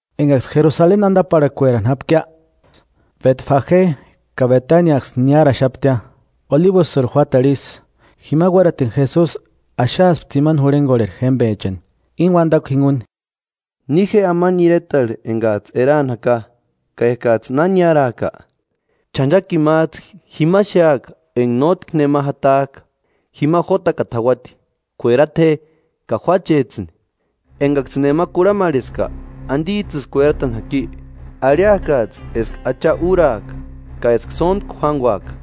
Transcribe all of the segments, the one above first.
Engaksï Jerusaleni andaparhakuerani jápkia, Betfage ka Betaniaksï niáraxapti, Olibusïrhu juátarhu isï, jima uératini Jesusi axaaspti tsimani jurhengorheri jémbechani, íni uandakua jinguni: –Ni je amani iretarhu engajtsï eraani jaka, ka ekajtsï na niárajka, ch'anchakini májtsï jima xéaka enga nótki nema jatajka, jima jótakata jauati. Kuerata je ka juáchejtsïni. Engaksïni nema kurhamarheska. ¿Andijtsïsï kueratani jaki? Arhiakajtsï eska Acha úraaka, ka eska sóntku juánguaka.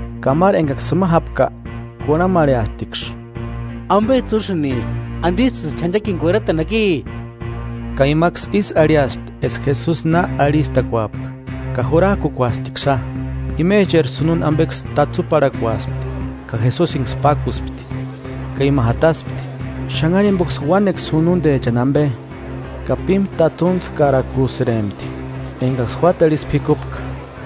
Ka máru engaksï jima jápka kurhamarheasptiksï: –¿Ambejtsï úsïnki? ¿Andijtsïsï ch'anchakini kueratani jaki? Ka imaksï ísï arhiaspti eska Jesusi na arhistakuapka; ka jurajkukuasptiksïia. Imecheri sununda ambeksï tatsuparhakuaspti, ka Jesusiniksï pákuspti, ka ima jataspti. Xanhari jimboksï uánekua sunundechani ambe, ka pímu tatsuntskarakusïrempti engaksï juátarhu isï p'ikupka.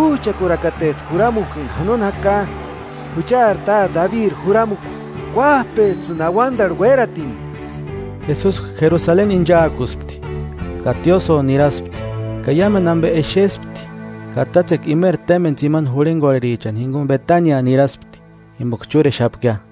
¡Újchakurakatesti juramukua enga janoni jaka, juchari Táte Dabiri juramukua! ¡K'uájpejtsïni auandarhu uératini! Jesusi Jerusaleni inchaakuspti, ka tiósïo niraspti. Ka iámendu ambe exespti, ka tátsekua imeri témbeni tsimani jurhengorherichani jinguni Betania niraspti, jimboka chúrexapkia.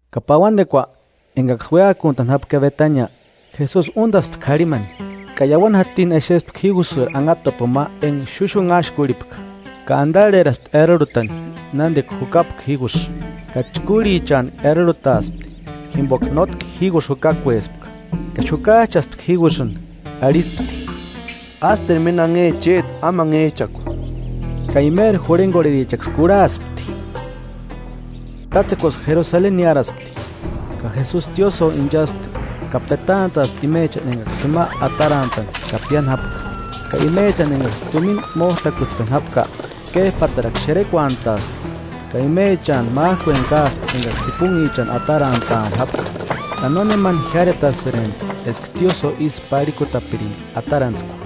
Ka pauandekua, engaksï uéakuntani jápka Betania, Jesusi úndaspti k'arhimani. Ka iauani jatini exespti jígusïri anhatapuni ma enga xuxunhaxkurhipka, ka andarheraspti erarhutani nándika jukapka jígusï, ka chkúrhichantku erarhutaaspti, jimboka nótki jígusï jukakuespka. Ka xukajchaspti jígusïni, arhispti: –¡Ásteru méni anhe chéti amanhejchakua! Ka imeri jurhengorherichaksï kurhaspti. Tátsekuaksï Jerusaleni niáraspti, ka Jesusi tiósïo inchaspti ka petantaaspti imechani engaksï jima atarantani ka piáni jápka. Ka imechani engaksï tumina mójtakutspeni jápka, kéjpatarakua xerekuantaaspti, ka imechantu májkueni káaspti engaksï jipunhichani atarantaani jápka; Ka nónemani jiáretasïrempti eska tiósïo ísï parhikutapiringa atarantskua.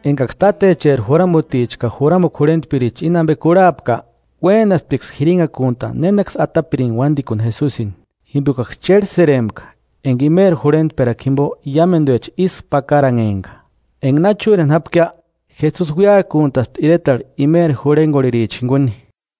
Engaksï tátecheri juramuticha ka juramukua jurhentpiricha íni ambe kurhapka, uénasptiksï jirinhakuntani nénaksï atapirini uándikuni Jesusini, jimbokaksï chérhesïrempka enga imeri jurhentperakua jimbo iámenduecha ísku pakaranhempka. Enga na chúreni jápkia, Jesusi uéakuntaspti iretarhu imeri jurhengorhericha jinguni.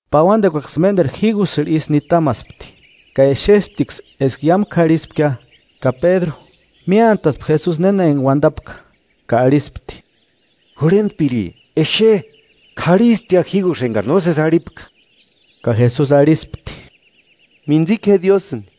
Pauandekuaksï ménderu jígusïrhu isï nitamaspti, ka exesptiksï eska iámu k'arhispkia. Ka Pédru, miántaspti Jesusi néna enga uandapka, ka arhispti: –Jurhentpiri exe, k'arhistia jígusï engari nósesi arhipka. Ka Jesusi arhispti: –Mintsika je Diósïni.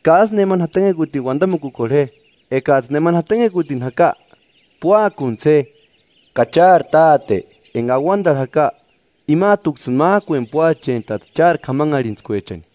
Ka ásï nemani jatanhekutini uandamukukorhe je, ekajtsï nemani jatanhekutini jaka, púakuntsï je, ka chári Táte enga auandarhu jaka, imajtuksïni májkueni púachentaati chári k'amanharhintskuechani.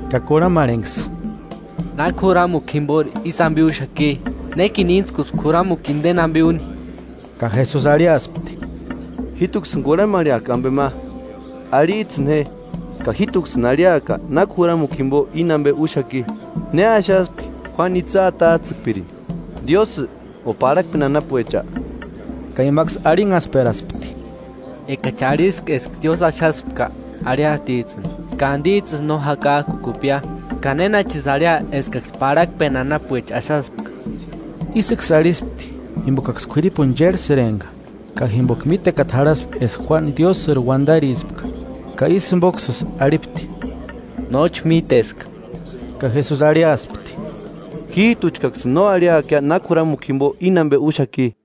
ka kurhamarhenksï: –¿Náki juramukua jimbori ísï ambe úxaki? ¿Nékini íntskuski juramukua indeni ambe úni? Ka Jesusi arhiaspti: –Jíjtuksïni kurhamarheaka ambe ma: Arhijtsïni je, ka jíjtuksïni arhiaka náki juramukua jimbo íni ambe úxaki. ¿Ne axaspki Juánu itsï atajtsïkpirini? ¿Diósï, o parhakpeni anapuecha? Ka imaksï arhinhaskperaspti: “Engachi arhiska eska Diósï axaspka, arhiatijtsïni, ka: ¿Andijtsïsï no jakajkukupkia? ¿Ka nénachisï arhia eskaksï parhakpeni anapuecha axaspka?” Ísïksï arhispti jimbokaksï k'uiripuni chérhesïrempka, ka jimboka mítekata jarhaspka eska Juánu Diósïri uandarispka. Ka ísï jimboksïsï arhipti: –Nóchi míteska. Ka Jesusi arhiaspti: –Jíjtuchkaksïni no arhiakia náki juramukua jimbo íni ambe úxaki.